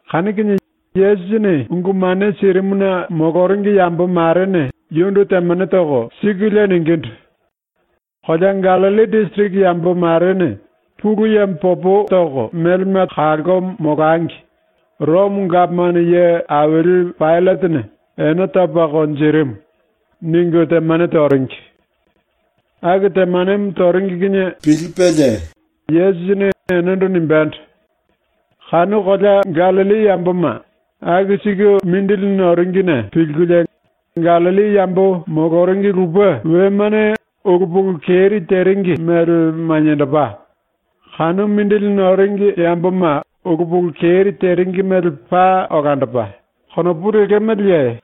Kanu kinie Yesusini ungu mane sirimuna moloringi yambo marene yundu temane toko sikulie ningindu: “Kolea Gallilli disiriki yambo marene Pulu Yemo popo melema toko kalko molangi ⸤Romo gapomano ye aili⸥ Paillatene ene topa konjirimu.” ningu temane toringi. Aku temanemo toringi kinie pilipelie Yesusini enendo nimbendo: “Kanu kolea Gallilli yamboma aku siku mindili noringine pilkulie ‘Gallilli yambo moloringi lupe wemane ulu pulu keri teringi mele maniendopa, kanu mindili noringi yamboma ulu pulu keri teringi mele paa olandopa.’ konopu lekemeleye?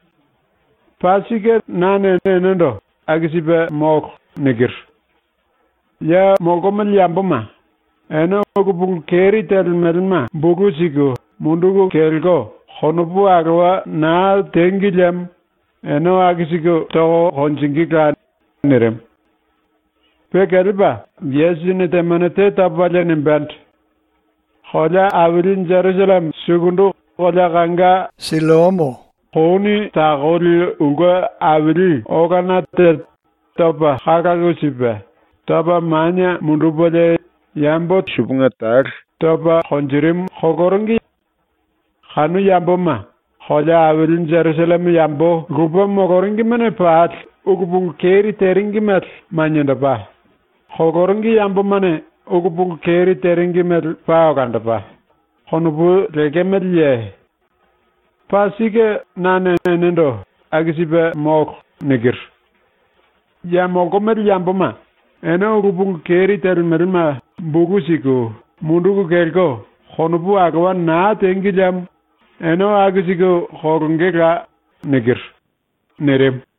Paa sike nane enendo “Aku sipe molo.” nikiru. Ya molkomele yamboma, ene ulu pulu keri telemelema bulu siku munduku kelko konopu alowa naa tengi liemo ene aku siku toko konjingíla.” nirimu. Pe kelepa Yesusini temane te topalie nimbendo: “Kolea aili Jerusalleme sukundu kolea kanga Silloamo kouni takoli ulke aili olana te topa kalalu sipe topa manie mundupelie yambo tene eti topa konjirimu koloringi. Kanu yamboma ‘Kolea aili Jerusalleme yambo lupe moloringimene pali ulu pulu keri teringi mele maniendopa, koloringi yambomane ulu pulu keri teringi mele paa olandopa.’ konopu lekemeleye? Paa sike nane enendo ‘Aku sipe molo.’ nikiru. Ya molkomele yamboma, ene ulu pulu keri telemelema bulu siku munduku kelko konopu alowa naa tengi liemo ene aku siku kolongela.” nirimu.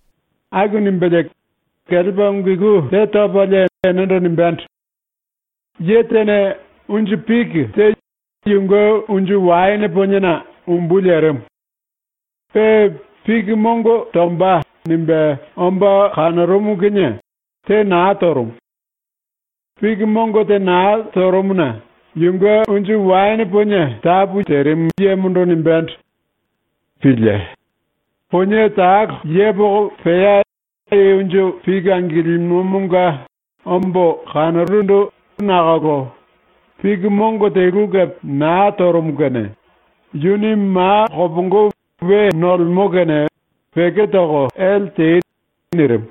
Aku nimbelie kelepa ungu iku te topalie enendo nimbendo: “Ye tene unju piki te yunge unju waene poniena umbu lerimu. Pe ‘Piki mongo tomba.’ nimbe omba kanorumu kinie te naa torumu. Piki mongo te naa torumuna yunge unju waene ponie tapu yemondo nimbendo: “Pílie. Ponie talo yepoko pea i unju piki angilimomonga ombo kanorundu nakolo piki mongo telu kepe naa torumu kene yuni ma kopongo we nolemo kene peko toko ele tei.” nirimu.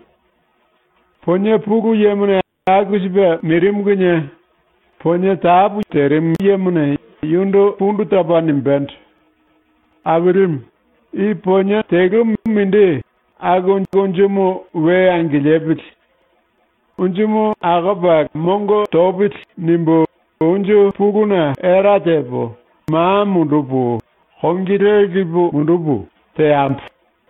Ponie pulu yemo aku sipe nirimu kinie ponie tapu yemone yundu pundu topa nimbendo: “Ailimu, i ponie telumu mindi aku unjumu we angilipili. ‘Unjumu akopa mongo topili.’ nimbu unju puluna era tepo, ma mundupu, kongi le lipu mundupu, teambo.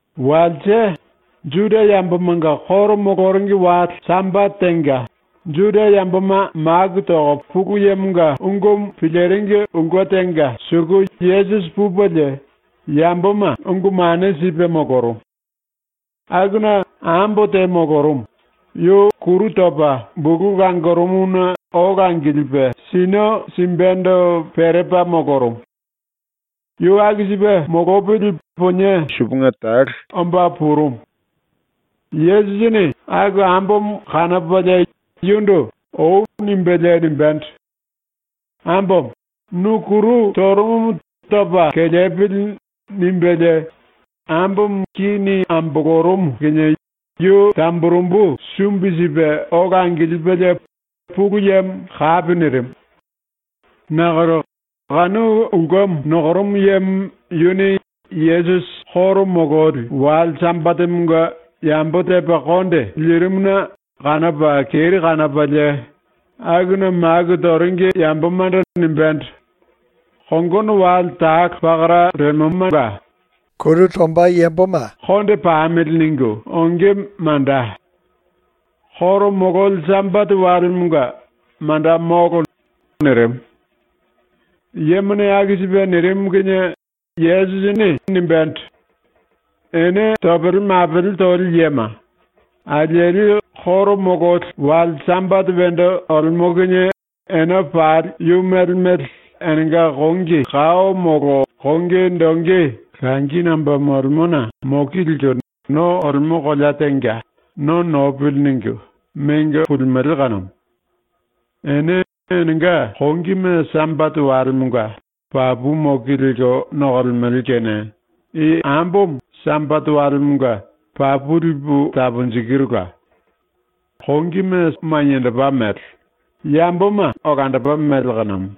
Walse, ⸤Juda yambomanga koro moloringi⸥ wale Sambate tenga Juda yamboma maku toko Pulu Yemonga ungumu piliringi ulke tenga suku Yesusi pupelie yamboma ungu mane sipe molorumu. Akuna ambo te molorumu, yu kuru topa bulu langorumuna ola angilipe sinio simbendo perepa molorumu. Yu aku sipe molopili ponie tene eti omba purumu. Yesusini kanu ambomo kanopalie yundu “Oi.” nimbelie nimbendo: “Ambomo, nu kuru torumumu topa kelepili.” nimbelie ambomo kini ambolorumu kinie yu tamburembu sumbi sipe ola angilipelie Pulu Yemo kapi nirimu. Nakolo kanu ulkemo nokorumu yemo yuni Yesusi ⸤koro mololi⸥ wale Sambatemonga yambo tepa konde lirimuna kanopa keri kanopalie akuna maku toringi yambomando nimbendo: “Kongono wale talo pakara lemomanga ‘Konde pamili.’ ningu onge manda. ⸤Koro mololi⸥ Sambate walemonga manda molo.” nirimu. Yemone aku sipe nirimu kinie Yesusini nimbendo: “Ene topele mapele toli yema, alieli ⸤koro mololi⸥ wale Sambate wendo olemo kinie ene pali yu mele mele enenga kongi kao molo kongi dongi langi nomba molorumuna moki lelko no olemo kolea tenga ‘No nopili.’ ningu mengo pulimele kanumu. Ene enenga kongime Sambate walemonga papu moki lelko nokolemele kene i ambomo Sambate walemonga papu lipu taponjikirula. Kongimu maniendopa mele, ambomo olandopa mele kanumu.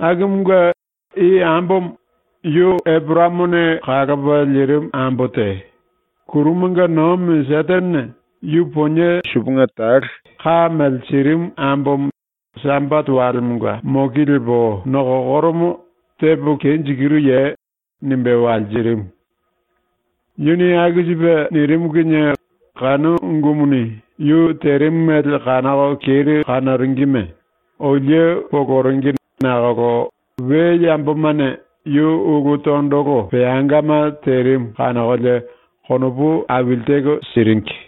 Akumunge i ambomo, yu Eporayamone kalopa lirimu ambo te, ⸤kurumanga nomi⸥ Setenene yu ponie tene eti ka mele sirimu ambomo Sambate walemonga moki lepo nokokoromo tepo kenjikiruye?” nimbe walsirimu. Yuni aku sipe nirimu kinie kanu ungumuni yu terimu mele kanoko keri kanoringime olie poloringi nakolo we yambomane yu ulu tondolo peangama terimu kanokolie konopu aili teko siringi.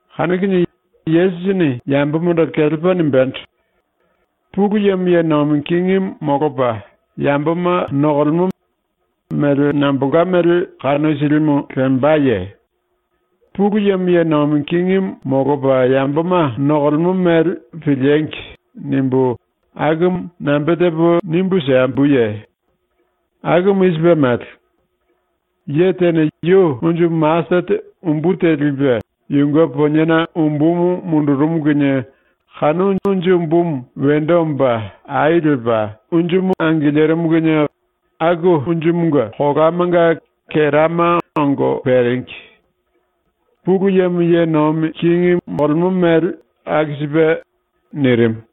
Kanu kinie Yesusini ⸤yambomando⸥ kelepa nimbendo: “Pulu Yemo ye nomi kingimu molopa yamboma nokomba, mele nambolka mele kanu silimu lembaye? ‘Pulu Yemo ye nomi kingimu molopa yamboma nokolemo mele piliengi!’ nimbu akumu nambe tepo nimbu simbuye? ⸤Nimbu siembo.⸥ Akumu i sipe mele: Ye tene yu unju masetete umbu te lipe yunge poniena umbumu mundurumu kinie kanu unju umbumu wendo omba ai lepa unjumu angilirimu kinie aku unjumunge kolamanga kerama ongo peringi. Pulu Yemo ye nomi kingi molomba mele aku sipe.” nirimu.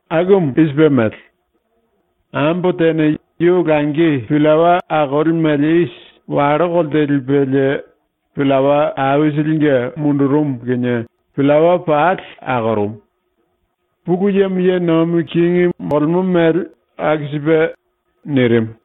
Akumu i sipe mele: Ambo tene yu langi pillawa akoli mele isi wallo kolte lipelie pillawa aisilinge mundurumu kinie pillawa pali akorumu. Pulu Yemo ye nomi kingi molomba mele aku sipe.” nirimu.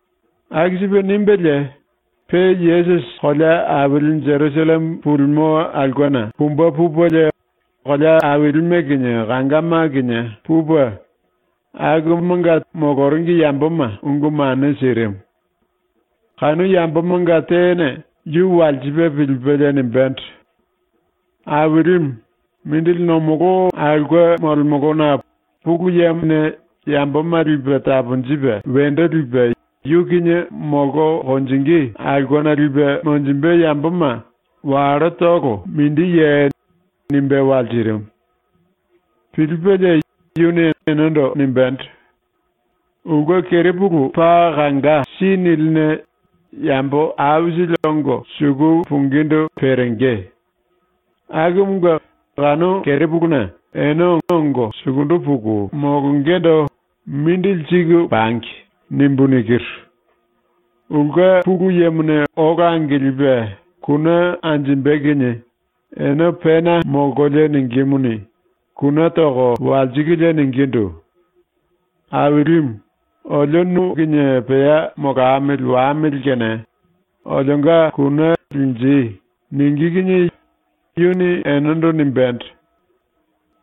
Aku sipe nimbelie pe Yesusi kolea aili Jerusalleme pulimo aulkena pumbe pupelie kolea ailime kinie kangama kinie pupe, akumanga moloringi yamboma ungu mane sirimu. Kanu yambomanga tene yu walsipe pilipelie nimbendo: “Ailimu, mindili nomolo aulke molemolona Pulu Yemone yamboma lipe taponjipe wendo lipe yu kinie molko konjingí aulkena lipe monjimbe yamboma wallotolo mindiye?” nimbe walsirimu. Pilipelie yuni enendo nimbendo: “Ulke kerepulu paa kanga si niline yambo aisili ongo suku pungindu perenge. Akumunge ‘Kanu kerepuluna ene ongo sukundu puku molongendo mindili siku pangi.’ nimbu nikiru. Ulke pulu yemone ola angilipe kune anjimbe kinie ene pena molkolie ningímuni, kune toko walsikulie ningindu: “Ailimu, olio nu kinie pea molamili wamili kene olionga kune linji.” ningí kinie yuni enendo nimbendo: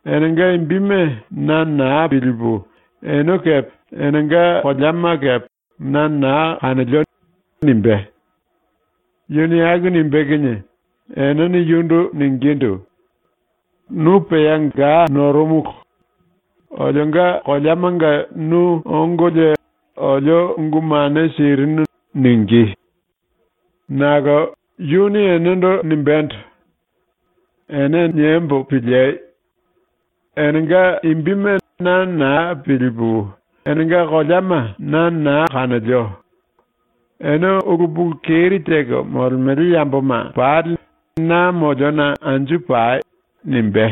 “Enenga imbime na naa pilipu ene kepe enenga koleama kepe na naa kanolio.” nimbé. “Yuni aku nimbé kinie enene yundu ningindu: “Nu pea ga norumulu. Olionga koleamanga nu ongolie olio ungu mane sirinu.” ningí. “Nakolo yuni enendo nimbendo: “Ene niembo piliei. Enenga imbime na naa pilipu enenga koleama na naa kanolio. Ene ulu pulu keri teko molemele yamboma pali na moliona anju pai.” nimbé.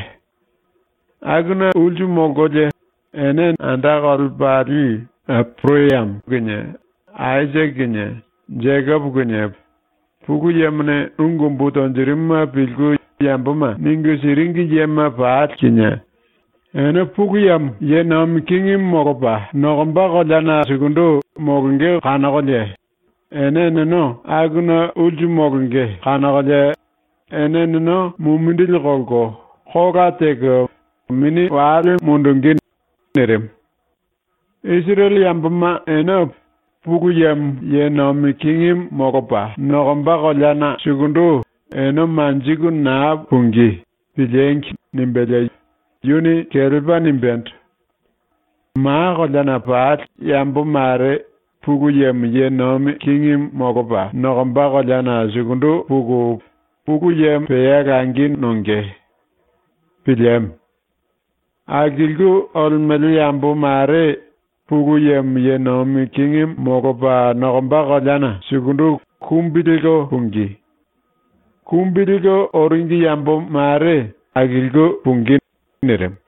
Akuna ulsu molkolie ene ⸤anda kolepali⸥ Eporayamo kinie, Aisake kinie, Jekopo kinie, Pulu Yemone ungu umbu tonjirimuma pilku yamboma ningu siringi yema pali kinie, ene Pulu Yemo ye nomi kingimu molopa nokomba koleana sukundu molonge kanokolie ene eneno akuna ulsu molonge kanokolie ene eneno mumindili kolko kola teko mini wale mundungí.” nirimu. Isirele yamboma ene Pulu Yemo ye nomi kingimu molopa nokomba koleana sukundu ene manjiku naa pungí ‘Piliengi!’ nimbelie yuni kelepa nimbendo: “Ma koleana pali yambo mare Pulu Yemo ye nomi kingimu molopa nokomba koleana sukundu puku Pulu Yemo pea langi nonge. Pilieme. Akilku olemele yambo mare Pulu Yemo ye nomi kingimu molopa nokomba koleana sukundu kumbi lelko pungí. Kumbi lelko oringi yambo mare akilku pungí.” nirimu.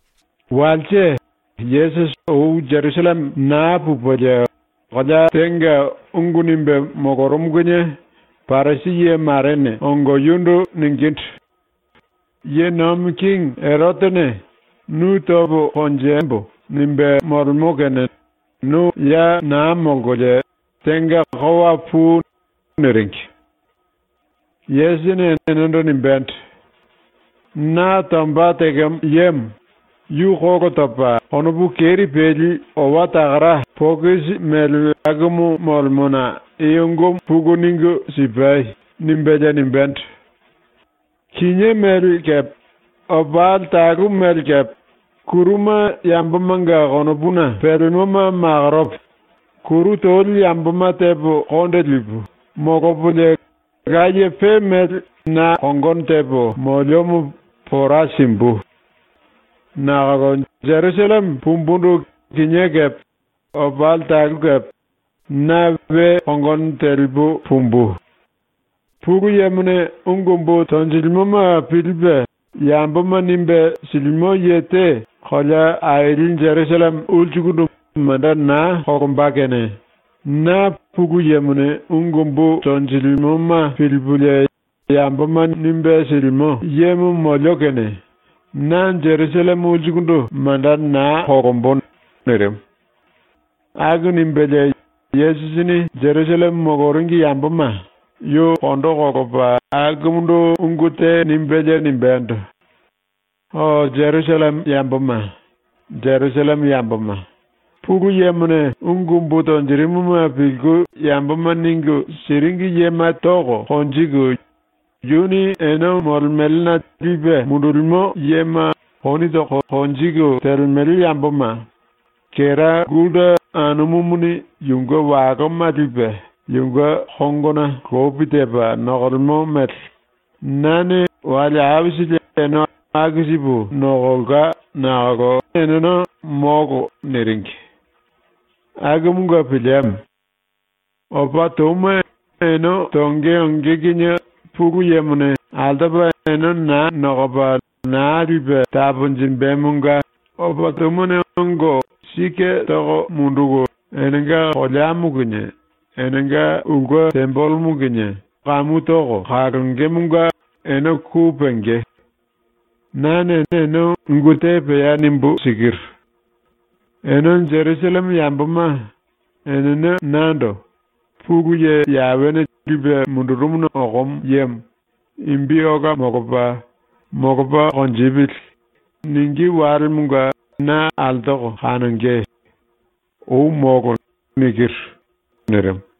Walse, Yesusi ou Jerusalleme naa pupelie kolea tenga ungu nimbe molorumu kinie Parisi ye marene ongo yundu ningindu: “⸤Ye nomi kingi⸥ Erotene ‘Nu topo konjembo.’ nimbe molemo kene nu ya naa molkolie tenga kowa pui.” niringi. Yesusini enendo nimbendo: “Na tomba tekemo yemo, yu kolo topa konopu keri peli owa takara pokisi mele akumu molemona i ungumu puku ningu sipai.” nimbelie nimbendo: “Kinié mele kepe opali talu mele kepe kuruma yambomanga konopuna pelemoma makoropo, kuru toli yamboma tepo konde lipu, molopolie laye pe mele na kongono tepo moliomo pora simbu. Nakolo Jerusalleme pumbundu kinié kepe opali talu kepe na we kongono telipu pumbu. Pulu Yemone ungu umbu tonjilimoma pilipe yamboma nimbe silimo ye te kolea aili Jerusalleme ulsukundu manda naa kolomba kene ⸤na Pulu Yemone ungu umbu tonjilimoma pilipulie yamboma nimbe silimo yemo molio kene⸥ na Jerusalleme ulsukundu manda naa kolombo.” ⸤nirimu.⸥ ⸤Aku nimbelie Yesusini Jerusalleme moloringi yamboma yu kondo kolopa akumundu ungu te nimbelie nimbendo:⸥ “O Jerusalleme ⸤yamboma⸥, Jerusalleme ⸤yamboma⸥, Pulu Yemone ungu umbu tonjirimuma pilku yamboma ningu siringi yema toko konjiku, yuni ene molemelena lipe mundulimo yema kouni toko konjiku telemele yamboma, kera gulta anumumuni yunge waloma lipe yunge kongona lopi tepa nokolemo mele nane wale aisili ene aku sipu nokolka nakolo eneno “Molo.” niringi. Akumunge pilieme. ⸤Opa touma ene tonge onge kinie Pulu Yemone altopa ene naa nokopa naa lipe taponjimbemonga⸥ opa toumane ongo sike toko munduku enenga koleamo kinie enenga ulke tembelemo kinie kamu toko kalongemonga ene ku penge. Nane ene ungu te pea nimbu sikiru: Ene Jerusalleme yamboma, enene nando “Pulu Ye Yawene lipe mundurumuna okomo yemo imbi ola molopa, molopa konjipili.” ningí walemonga na altoko kanonge. Ou molo.” nirimu.